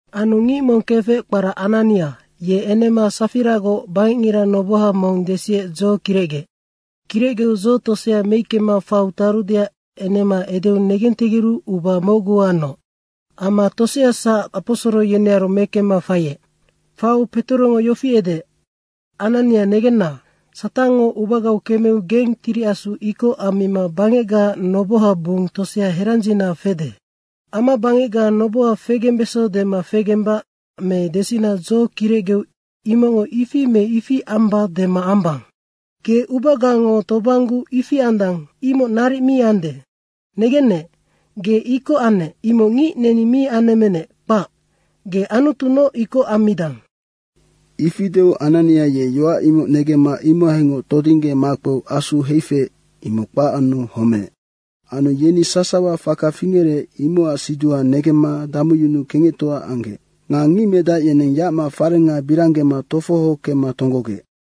Anu ngic mong kefec kpara Anania, ye enema Safiragoc bangecngira noboha mong desiec dzo kirecgeec. Kirecgeu dzo tosea meickema faiu tarudeac enema edeu negentegeru uba mocgu anoc. Amma toseasac aposoro yenearu mekemma faiec. Faiu Petorongo yofi edeec, “Anania negenna, Satangngo ubagau kemeu geng Tiri Asu ikoc ammima bangecga nobohaac bung tosea herandzina fede. Amabangecga noboha fegembeso dema fegembac me desina dzo kirecgeu imocngo ‘ifi me ifi amba’ dema ambang. Ge ubagango tobangguu ifi andang, imoc naric mi ande. Negennec, ge ikoc annec, imoc ngic neni mi anemmenec, kpac. Ge Anutunoc ikoc ammidang.” Ifi deu Anania ye yoac imoc negemma imohaingoc todingge makpeu asu heifeec, imoc kpac anu homeec. Anu yeni sasawango faka fingerec, imocac siduha negemma damuyunuu kengectoa anggec. Nga ngicmedac yeneng yacma farenga biranggema tofoho kemma tonggogec.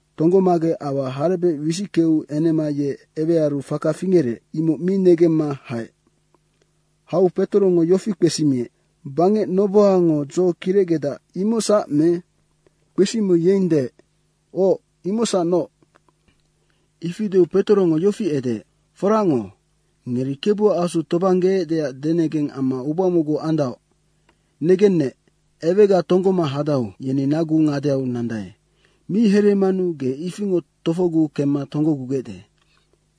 Tonggomagec aua harebec wisickeu enema ye ewearu faka fingerec, imoc mi negemma haec. Hau Petorongo yofi kpesimiec, “Bangec nobohango dzo kirecgedac, imocsac me?” kpesimiu yeng deec, “Oc, imocsacnoc.” Ifi deu Petorongo yofi edeec, “foracngoc, ngeri Kebuac Asu tobanggeecdeac denegeng amma uba mocgu andaoc. Negennec, ewega tonggoma hadau, yeni nagu ngadeau nandae, mi hereemanu ge ifingoc tofogu kemma tonggogugecde.”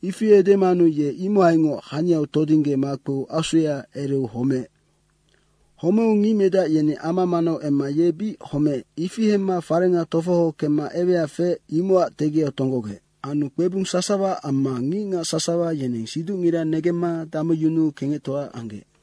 Ifi edemanu ye imohaingoc haniau todingge makpeu asuya ereu homeec. Homeu ngicmedac yeni ama manau emma ye bic homeec, ifi hemma farenga tofoho kemma ewea feec, imocac tegiau tonggogec. Anu kpebung sasawa amma ngicngac sasawa yeneng siducngira negemma damuyunuu kengectoa anggec.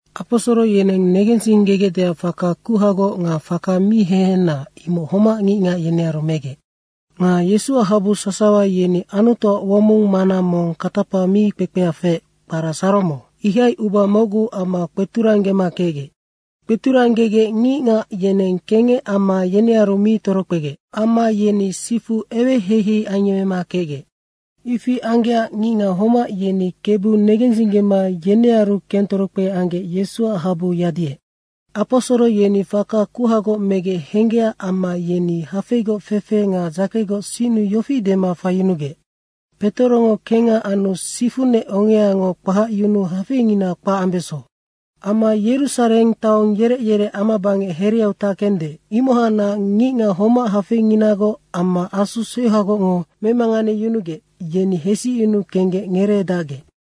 Aposoro yeneng negensinggegecdeac faka kuhagoc nga faka mi hehena, imoc homac ngicngac yenearu megec. Nga Yesuac habu sasawa yeni Anutuac womong mana mong katapa mi kpekpea feec, kpara Saromo, ihai uba mocgu amma kpeturanggema kecgec. Kpeturanggegec ngicngac yeneng kengec amma yenearu mi torokpegec. Amma yeni sifu eweheihei ayemmema kecgec. Ifi anggecac ngicngac homac yeni Kebu negensinggema yenearu kentorokpe anggec Yesuac habu yadiec. Aposoro yeni faka kuhagoc megec henggecac amma yeni hafeigoc fefe nga dzakegoc sinnu yofi dema faiyunugec, “Petorongo kengha anu sifunec ongeango kpahacyunuu hafeingina kpac ambeso.” Amma Yerusareng taong yerec yerec amabangec hereau tackende, imohacnac ngicngac homac hafeinginagoc amma asu seuhagocngo memanganeyunugec, yeni hesicyunu kenggec ngereedacgec.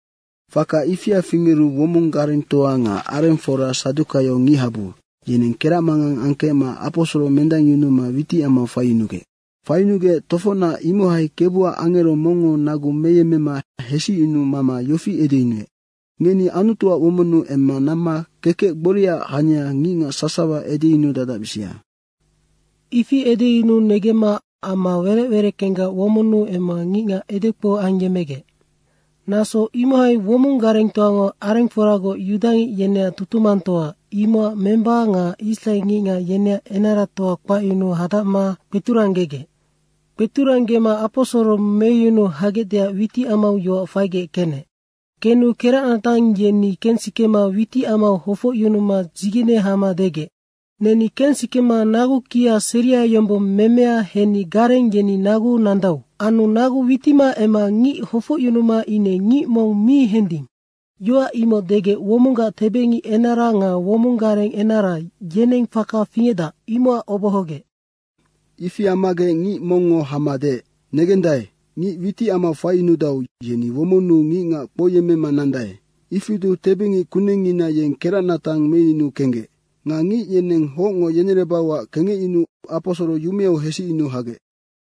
Faka ifia fingeru womong garengtoa nga arengfora sadukaio ngichabu, yeneng keracmangang angkecma aposoro mendangyunuma witicamau faiyunugec. Faiyunugec tofocnac imohai Kebuac angero mongngo nagu meyemmema hesicyunuu mama yofi edeyunuec. “Ngeni Anutuac womonnu emma namma kekec gboriaac hania ngicngac sasawa edeyunudadacbisia.” Ifi edeyunuu negemma ama werec wereckenggac womonnu emma ngicngac edekpou ayemmegec. Naso imohai womong garengtoango arengforagoc yudangic yeneac tutumangtoa, imocac memba nga israe ngicngac yeneac enaratoa kpacyunuu hadacma kpeturanggegec. Kpeturanggema aposoro meyunu hagecdeac witicamau yoac faigec kenec. Kenu keracnatang yeni kensikema witicamau hofocyunuma dzigene hama degec, “Neni kensikema nagu kia seria yombong memea henni gareng yeni naguu nandau. Anu nagu witima emma ngic hofocyunuma ine ngic mong mi hending.” Yoac imoc degec womonggac tebengic enara nga womong gareng enara, yeneng faka fingecdac, imocac obohogec. Ifi ammagec ngic mongngo hama deec, “Negendae, ngic witicamau faiyunudau, yeni womonnu ngicngac kpouyemmema nandae.” Ifi deu tebengic kunengngina yeng keracnatang meyunuu kenggec. Nga ngic yeneng hocngo yenerebauac kengecyunuu aposoro yumeau hesicyunu hagec.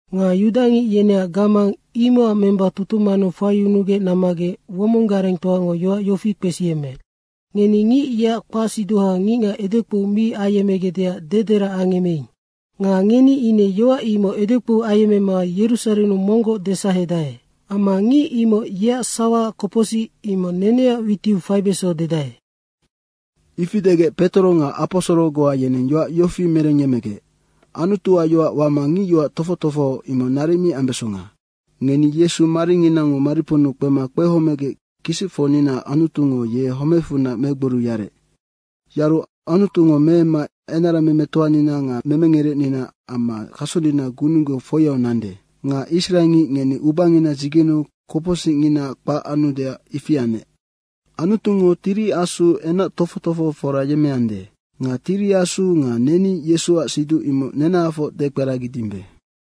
Nga yudangic yeneac gamang, imocac memba, tutumannu faiyunugec nammagec womong garengtoango yoac yofi kpesiyemmeec. “Ngeni ngic yeac kpacsiduha ngicngac edekpou mi ayemmegecdeac dederac angemmeing. Nga ngeni ine yoac imoc edekpou ayemmema Yerusarennu monggoc desahedae. Amma ngic imoc yeac sawaac kopocsic, imoc neneac witiu faibeso dedae.” Ifi degec Petoro nga aposoro goa yeneng yoac yofi merengyemmegec, “Anutuac yoac wama ngicyoac tofoc tofoho, imoc naric mi ambesonga. Ngeni Yesu maringinango mariponnu kpema kpehomegec kisicfocninaac Anutungo ye homecfunac megboriu yarec. Yaru Anutungo meemma enaramemetoanina nga memengerecnina amma kasonina gununggeu foiau nande. Nga israengic ngeni ubangina dzigeneu kopocsicngina kpac anudeac ifi anec. Anutungo Tiri Asu enac tofoc tofohofora yemmeande. Nga Tiri Asu nga neni Yesuac siduc imoc nenahafoc dekperagidimbe.”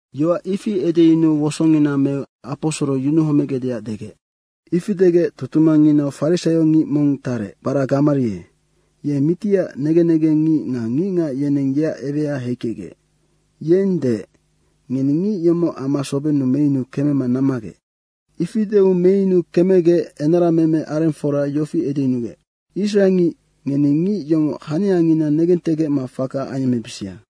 Yoac ifi edeyunuu wosongina meu aposoro yunuhomegecdeac degec. Ifi degec tutumangnginau farisaiongic mong tarec, kpara Gamarie, ye mitiac negen negengngic nga ngicngac yeneng yeac ewea heikecgec. Yeng deec, “Ngeni ngic yomoc ama sobennu meyunu kemema nammagec.” Ifi deu meyunu kemegec enarameme arengfora yofi edeyunuec, “Israengic, ngeni ngic yomoc haniangina negentegecma faka ayemmebisia.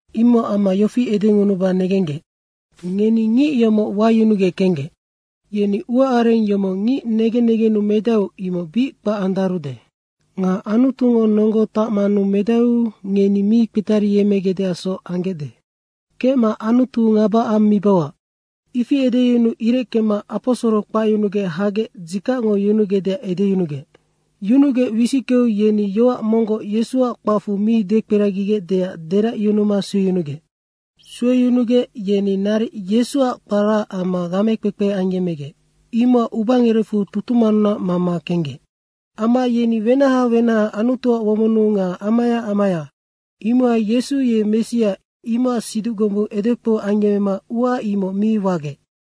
Imocac amma yofi edengunuba negenggec, ngeni ngic yomoc wayunugec kenggec. Yeni uaareng yomoc ngic negen negennu medaeu imoc bic kpac andarude. Nga Anutungo nonggo tacmanu medaeu ngeni mi kpetariyemmegecdeacsoc anggecde. Kecma Anutu ngaba ammibauac.” Ifi edeyunuu ireckema aposoro kpacyunugec hagec dzikacngo yunugecdeac edeyunugec. Yunugec wisickeu yeni yoac monggoc Yesuac kpacfu mi dekperagigecdeac deracyunuma sueyunugec. Sueyunugec, yeni naric Yesu kparaac amma gamekpekpe ayemmegec, imocac ubangerecfu tutumannunac mama kenggec. Amma yeni wenaha wenaha Anutuac womonnu nga amaya amaya, imohai Yesu ye Messia imocac siduc gombung edekpou ayemmema ua imoc mi wagec.